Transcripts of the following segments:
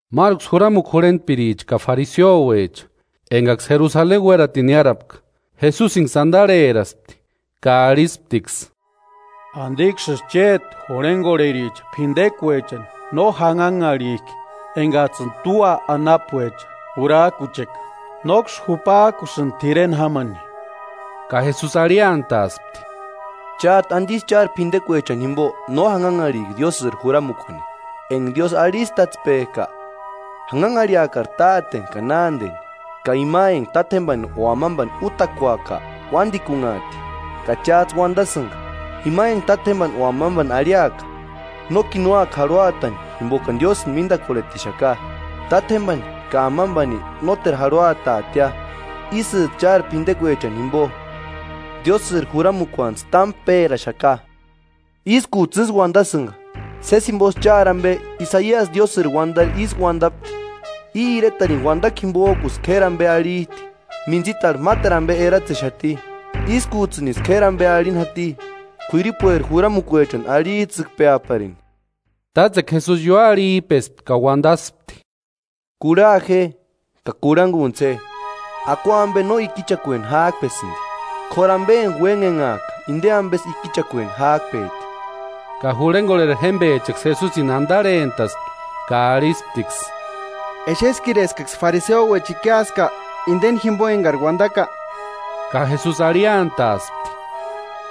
Máruksï juramukua jurhentpiricha ka fariseuecha enkaksï Jerusaleni uératini niárapka, Jesusinksï antarheraspti ka arhisptiksï: “¿Antiksïsï chéti jurhenkorhericha p'intekuechani no janhanharhik'i enkats'ïni tua anapuecha jurak'ucheka? Nóksï jupak'usïnti t'ireni jámani.” Ka Jesusi arhiantaaspti: “¿Chát'u antisï chári p'intekuechani jimpo no janhanharhik'i Diósïri juramukuani? Enka Diósï arhistatspek'a: ‘Janhanharhiakari táteni ka nánteni’ ka ‘Ima enka tátjempani o amampani útakuaka uántikunhaati.’ Ka cháts'ï uantasïnka: ‘Ima enka tátjempani o amampani arhiaka; nókini úaka jarhuatani jimpokani Diósïni míntakorhetixaka, tátjempani ka amampani nóteru jarhuataatia.’ Ísïts'ï chári p'intekuechani jimpo, Diósïri juramukuantsï támu péraxaka. Ískuts'ï ísï uantasïnka, sési jimposï chári ampe Isaiasi Diósïri uantari ísï uantapti: ‘I iretarini uantakua jimpok'usï k'éri ampe arhit'i, mintsitarhu máteru ampe eratsexati, ískuts'ïnisï k'éri ampe arhini jati, k'uiripueri juramukuechani arhits'ïkpeaparini.’” Tátsekua Jesusi ióarhip'espti ka uantaspti: “Kurha je ka kurhankuntsï je: Akua ampe no ikichakueni jáp'esïnti, k'óru ampe enka uénhenhak'a inte ampesï ikichakueni ják'pet'i.” Ka jurhenkorheri jémpechaksï Jesusini antarhentaspti ka arhisptiksï: “¿Exeskiri eskaksï fariseuecha ikiaska inteni jimpo enkari uantaka?” Ka Jesusi arhiantaaspti: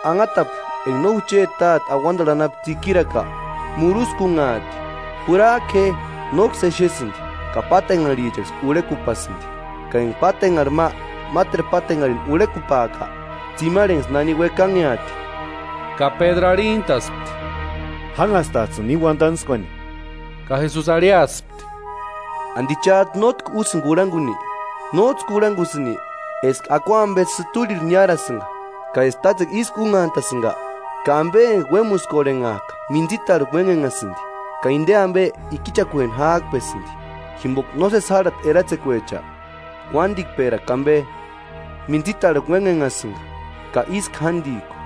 “Anhatapu enka no jucheti Táte auantarhu anapu tsikirika, muruskunhaati. Jurak'u je; nóksï exesïnti ka pátenharhichanksï urhekupaasïnti, ka enka pátenharhi ma máteru pátenharhini urhekupaaka, tsimarhenksï nani uekanheati.” Ka Pédru arhintaspti: “Jánhastats'ïni íni uantantskuani.” Ka Jesusi arhiaspti: “¿Anti chát'u nótki úsïnki kurhankuni? ¿Nóts'ï kurhankusïnki eska akua ampe sïturhirhu niárasïnka ka eska tátsekua ísku únhantasïnka? Ka ampe enka uémuskorhenhak'a mintsitarhu uénhenhasïnti, ka inte ampe ikichakueni jáp'esïnti, jimpoka nósesi járhati eratsekuecha, uántikperakua ampe, mintsitarhu uénhenhasïnka, ka ísku jántikua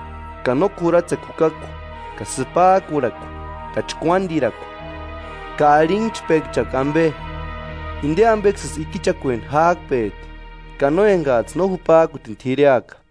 ka no k'uratsekua jukakua, ka sïpak'urhakua, ka chkuántirakua, ka arhinhchpenhchakua ampe. Inte ampeksïsï ikichakueni jáp'et'i, ka no enkats'ï no jupak'utini t'ireaka.”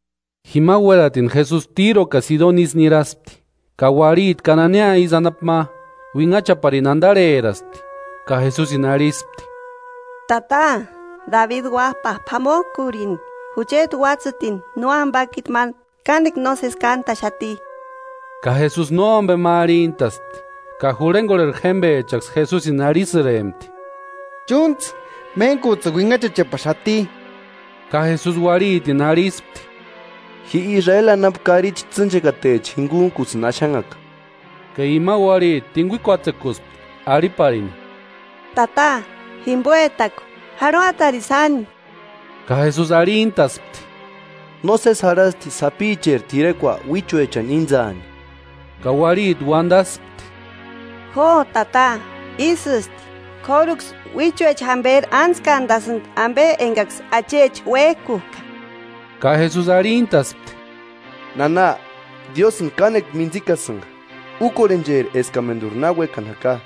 Jima uératini Jesusi Tíro ka Sidoni isï niraspti. Ka uarhiti Kananea isï anapu ma, uinhachaparini antarheraspti ka Jesusini arhispti: “¡Tata, Dabidi Uáp'a, p'amok'urini! Jucheti uátsïtini nóampakiti ma kánekua nósesi kántaxati.” Ka Jesusi nómpe ma arhintaspti. Ka jurhenkorhe jémpechaksï Jesusi arhisïrempti: “Chúntsï, méntkuts'ïni uinhachachepaxati.” Ka Jesusi uarhitini arhispti: “Ji Israeli anapu karichi tsînchekatecha jinkuntkusïni axanhaka.” Ka ima uarhiti tinkuikuatsekuspti arhiparini: “¡Tata, jimpoetaku, jarhuatarini sáni!” Ka Jesusi arhintaspti: “Nósesi jarhasti sapicheri t'irekua uíchuechani íntsaani.” Ka uarhiti uantaspti: “Jo Tata, ísïsti, k'óruksï uíchuecha jamperi ántskantasïnti ampe enkaksï achecha uék'uk'a.” Ka Jesusi arhintaspti: “¡Nana, Diósïnti kánekua mintsikasïnka! Úkorhencheri eskamenturi na uékani jaka.”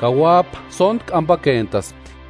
Ka uáp'a sóntku ampakentaspti.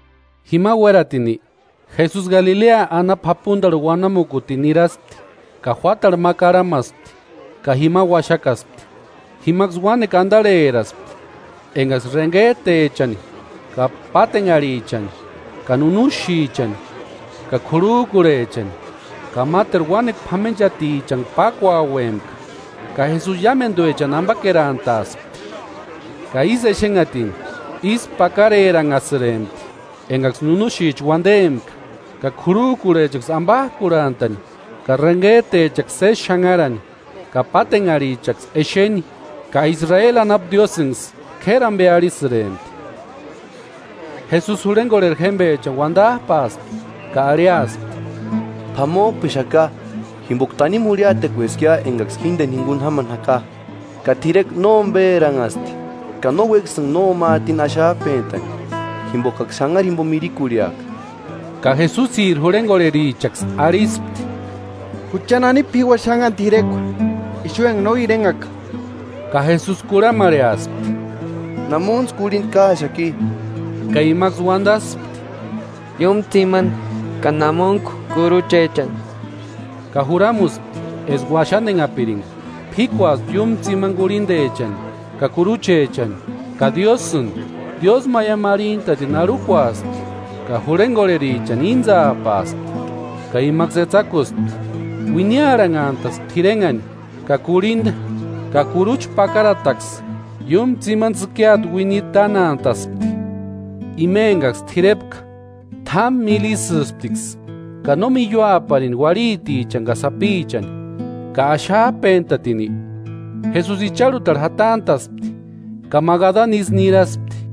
Jima uératini, Jesusi Galilea anapu japuntarhu uanamukutini niraspti, ka juátarhu ma karhamaspti ka jima uaxakaspti. Jimaksï uánekua antarheraspti enkaksï renhet'echani ka pátenharhichani ka nunuxichani ka k'urhuk'urhechani, ka máteru uánekua p'amenchatichani pákuauempka, ka Jesusi iámentuechani ampakerantaaspti. Ka ísï exenhatini ísku pakareranhasïrempti enkaksï nunuxicha uantempka, ka k'urhuk'urhechaksï ampak'urhantani, ka renhet'echaksï sési xanharani, ka pátenharhichaksï exeni. Ka Israeli anapu Diósïnksï k'éri ampe arhisïrempti. Jesusi jurhenkorheri jémpechani uantap'aaspti ka arhiaspti: “P'amok'pexaka jimpoka tanimu jurhiatekueskia enkaksï jínteni jinkuni jámani jaka, ka t'irekua nómperanhasti, ka no uékasïnka nóma atini axap'entani, jimpokaksï xanhari jimpo mirikurhiaka.” Ka Jesusiri jurhenkorherichaksï arhispti: “¿Jucha nani p'iua xáni káni t'irekua ixu enka no irenhaka?” Ka Jesusi kurhamarheaspti: “¿Namuntsï kurhinta káaxaki?” Ka imaksï uantaspti: “Iúmu tsimani ka namuntku kuruchechani.” Ka juramuspti eska uaxantenhapirinka. P'íkuaspti iúmu tsimani kurhintechani ka kuruchechani ka Diósïni diósïmaiamu arhintatini arhukuaspti, ka jurhenkorherichani íntsapaaspti ka imaksï etsakuspti. Uiniarhanhantaspti t'irenhani, ka kurhinta ka kurucha pakarataksï iúmu tsimani tsïkiata uiniri tánantaspti. Ima enkaksï t'irepka t'ámu míli ísïsptiksï ka no miiuaparini uarhitichani ka sapichani. Ka axap'entatini, Jesusi icharhutarhu jatant'a'spti ka Magadani isï niraspti.